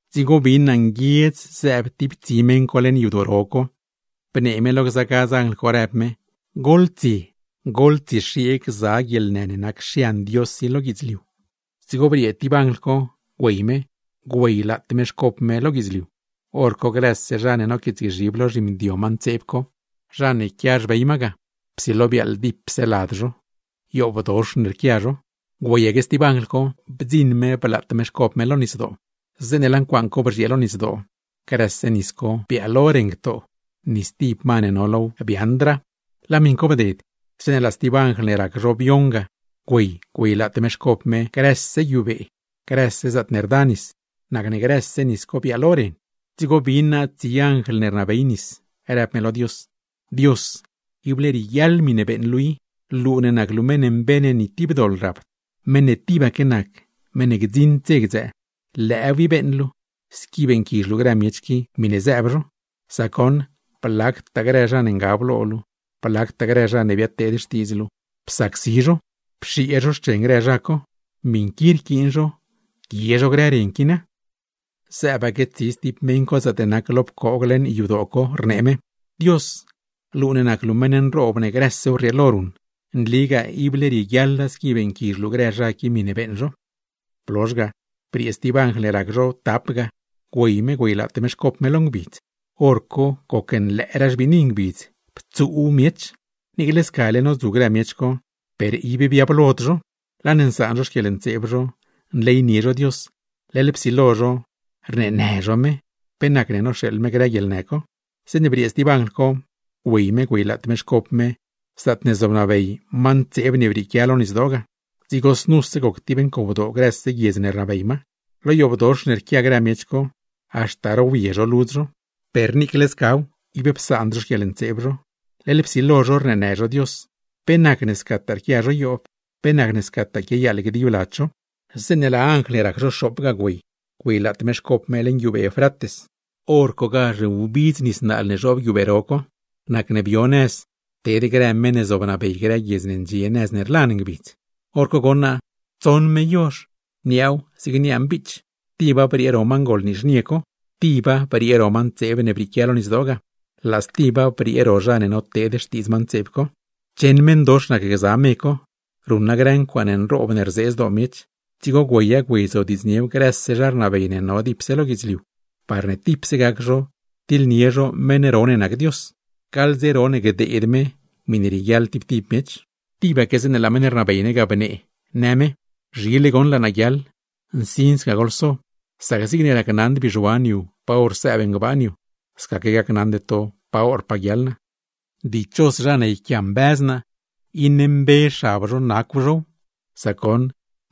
Dzigo bin naa nguiedz zëëb tib tsi meṉ co leṉ yadoo ro co, bnee me lo gza gadz anjl co, rëb me: ―Goḻtsie, goḻtsiexiee gza guieḻnë ne nac xian Dios i lo guidzliu. Dzigo briee tib anjl co, güey me, güeylaat me xcop me lo guidzliu, hor co grëse zha ne noquiitsgzhib lo zhimdio ma ntseeb co, zha ne quia xbey ma ga, psilo biaaḻ dipse lad zo, yoobdox ne rquia zho. Güeyaque stib anjl co, bdziṉ me blaat me xcop me lo nisdoo, zeeṉe laa ncuaaṉ co bzhiee lo nisdoo, grëse nis co biaalo ren ctoo; ni stib ma ne no low biaaṉdraa. Laa miṉ co bded, zeeṉe laa stib anjl ne rac zho bioṉ ga güey, güeylaat me xcop me grëse guiubee, grëse zaatne rda nis; nacne grëse nis co biaalo ren. Dzigo bin naa tsi anjl ne rnabey nis, rëb me lo Dios: ―Dios, ible rieguiaḻ miṉe beeṉ luu i; luu ne nac luu meṉ mbe ne ni tib doḻ rapd, meṉ ne tibaque nac, meṉ ne gdziṉd dze gdzëë. Lëëw i beeṉ luu, squi beeṉquizh luu grë miech qui miṉe zëëb zho, sac goṉ blactaa grë zha ne ngab lo luu, blactaa grë zha ne biadteed xtiidz luu psacsi zho, pxiee zho xchen grë zha co. Miṉ qui rquiin zho, guie zho grë ren qui na. Zëëbaque tsi stib meṉ co zaatne nac lo pcoog leṉ yadoo co, rnee me: ―¡Dios, luu ne nac luu meṉ ne nroob ne grësew rrieelo ruṉ, nligaa ible rieguiaḻa squi beeṉquizh luu grë zha qui miṉe beeṉ zho! Blozh ga, briee stib anjl ne rac zho tap ga, güey me güeylaat me xcop me lo ngbidz, hor co gocnlëëraa xbiini ngbidz, ptsuuw miech. Niicle scale nodzu grë miech co, per ib biablod zho, laa ne nsaan zho xquieḻntseeb zho, nleynie zho Dios, leḻ psilo zho rneenë zho me, pe nacne noxeeḻ me grë guieḻnë co. Zeeṉe briee stib anjl co, güey me güeylaat me xcop me zaatne zobnabey ma ntseeb ne brieequia lo nisdoo ga, dzigo znuse goc tib ncowdoo grëse guiedz ne rnabey ma. Lo yoobdox ne rquia grë miech co, haxta rowye zho ludz zho; per niicle scaw, ib psaand zho xquieḻntseeb zho, leḻ psilo zho rneenë zho Dios, pe nacne scataa rquia zho yoob, pe nacne scataa quiayaaḻ gdib lad zho. Zeeṉe laa anjl ne rac zho xoop ga güey, güeylaat me xcop me leṉ guiubee Eufrates, hor cogazh wbidz nis naal ne zhoob guiubee ro co. Nacne bio nëz ted grë meṉ ne zobnabey grë guiedz ne ndxie nëz ne rlan ngbidz. Horco goṉ naa tsoṉ me yozh, niaaw zig niaa mbiich, tiba briee ro ma ngol nizhnie co, tiba briee ro ma ntseeb ne brieequia lo nisdoo ga, laa stiba briee ro zha ne noteed xtiidz ma ntseeb co. Cheṉ meṉdox nac gza me co, ruṉa grë ncuaaṉe nroob ne rzee zdoo miech; dzigo güeya güeyzodiidzniew grëse zha rnabey ne no dipse lo guidzliu, parne tipse gac zho tiḻnie zho meṉ ro ne nac Dios, gaḻ dze ro ne gdeed me miṉe rieguiaḻ tib tib miech. Tibaque zeeṉe laa meṉ ne rnabey ne ga bnee, në me: ―Zhile goṉ laa naa guiaḻ. Nsin sca goḻso, sac zigne racnaṉd bizhuan yu pa hor sëëb ngbaan yu, scaque gacnaṉde to pa horpaa guiaḻ naa. Dichos zha ne yquiambëz naa, iṉe mbe xab zho nacw zhow; sac goṉ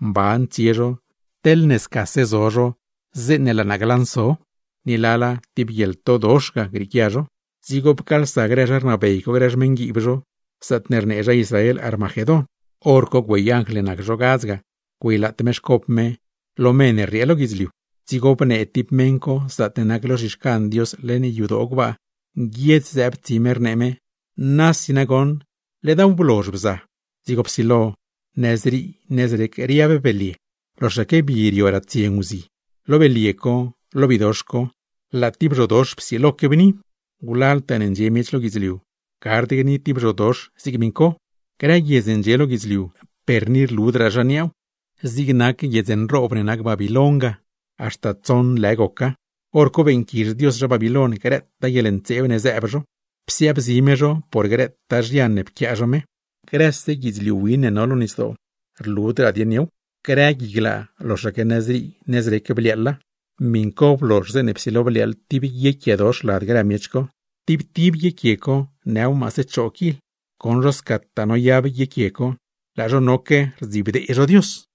mban tsie zho teḻne scase zo zho zeeṉe laa naa glanso, ni lala tib guieḻtodox ga grieequia zho. Dzigo pcaalsa grë zha rnabey co grë xmeṉguiib zho, zaatne rnee zha Israel Armagedón. Horco güey anjl ne nac zho gadz ga güeylaat me xcop me lo me ne rriee lo guidzliu; dzigo bnee tib meṉ co zaatne nac lo zhixcan Dios leṉ yadoo gbaa ga, nguiedz zëëb tsi me rnee me: ―¡Nasi nagoṉ ledaaw blozh bza! Dzigo psilo nëzrii nëzrec riab belye, loxaque bi rio ratsie nguzi. Lo belye co, lo bidox co, laa tib zhodox psiloque bni; wlaltaa ne ndxie miech lo guidzliu, gard gni tib zhodox zig miṉ co. Grë guiedz ne ndxie lo guidzliu, per ni rludraa zha niaaw; zig nac guiedz nroob ne nac Babiloin ga, haxta tsoṉ lë goca. Horco beeṉquizh Dios zha Babiloin, grëtaa guieḻntseeb ne zëëb zho; psiaabzi me zho por grëtaa zhian ne pquiaa zho me. Grëse guidzliu win ne no lo nisdoo, rludraa dieṉ yow; grë gui glaa, loxaque nëzrii nëzrec bliaaḻa. Miṉ co blozh, zeeṉe psilo bliaaḻ tib guiequiedox lad grë miech co, tib tib guiequie co nëw maase choo kil. Goṉ zho scataa noyab guiequie co, laa zho noque rdzibdee zho Dios.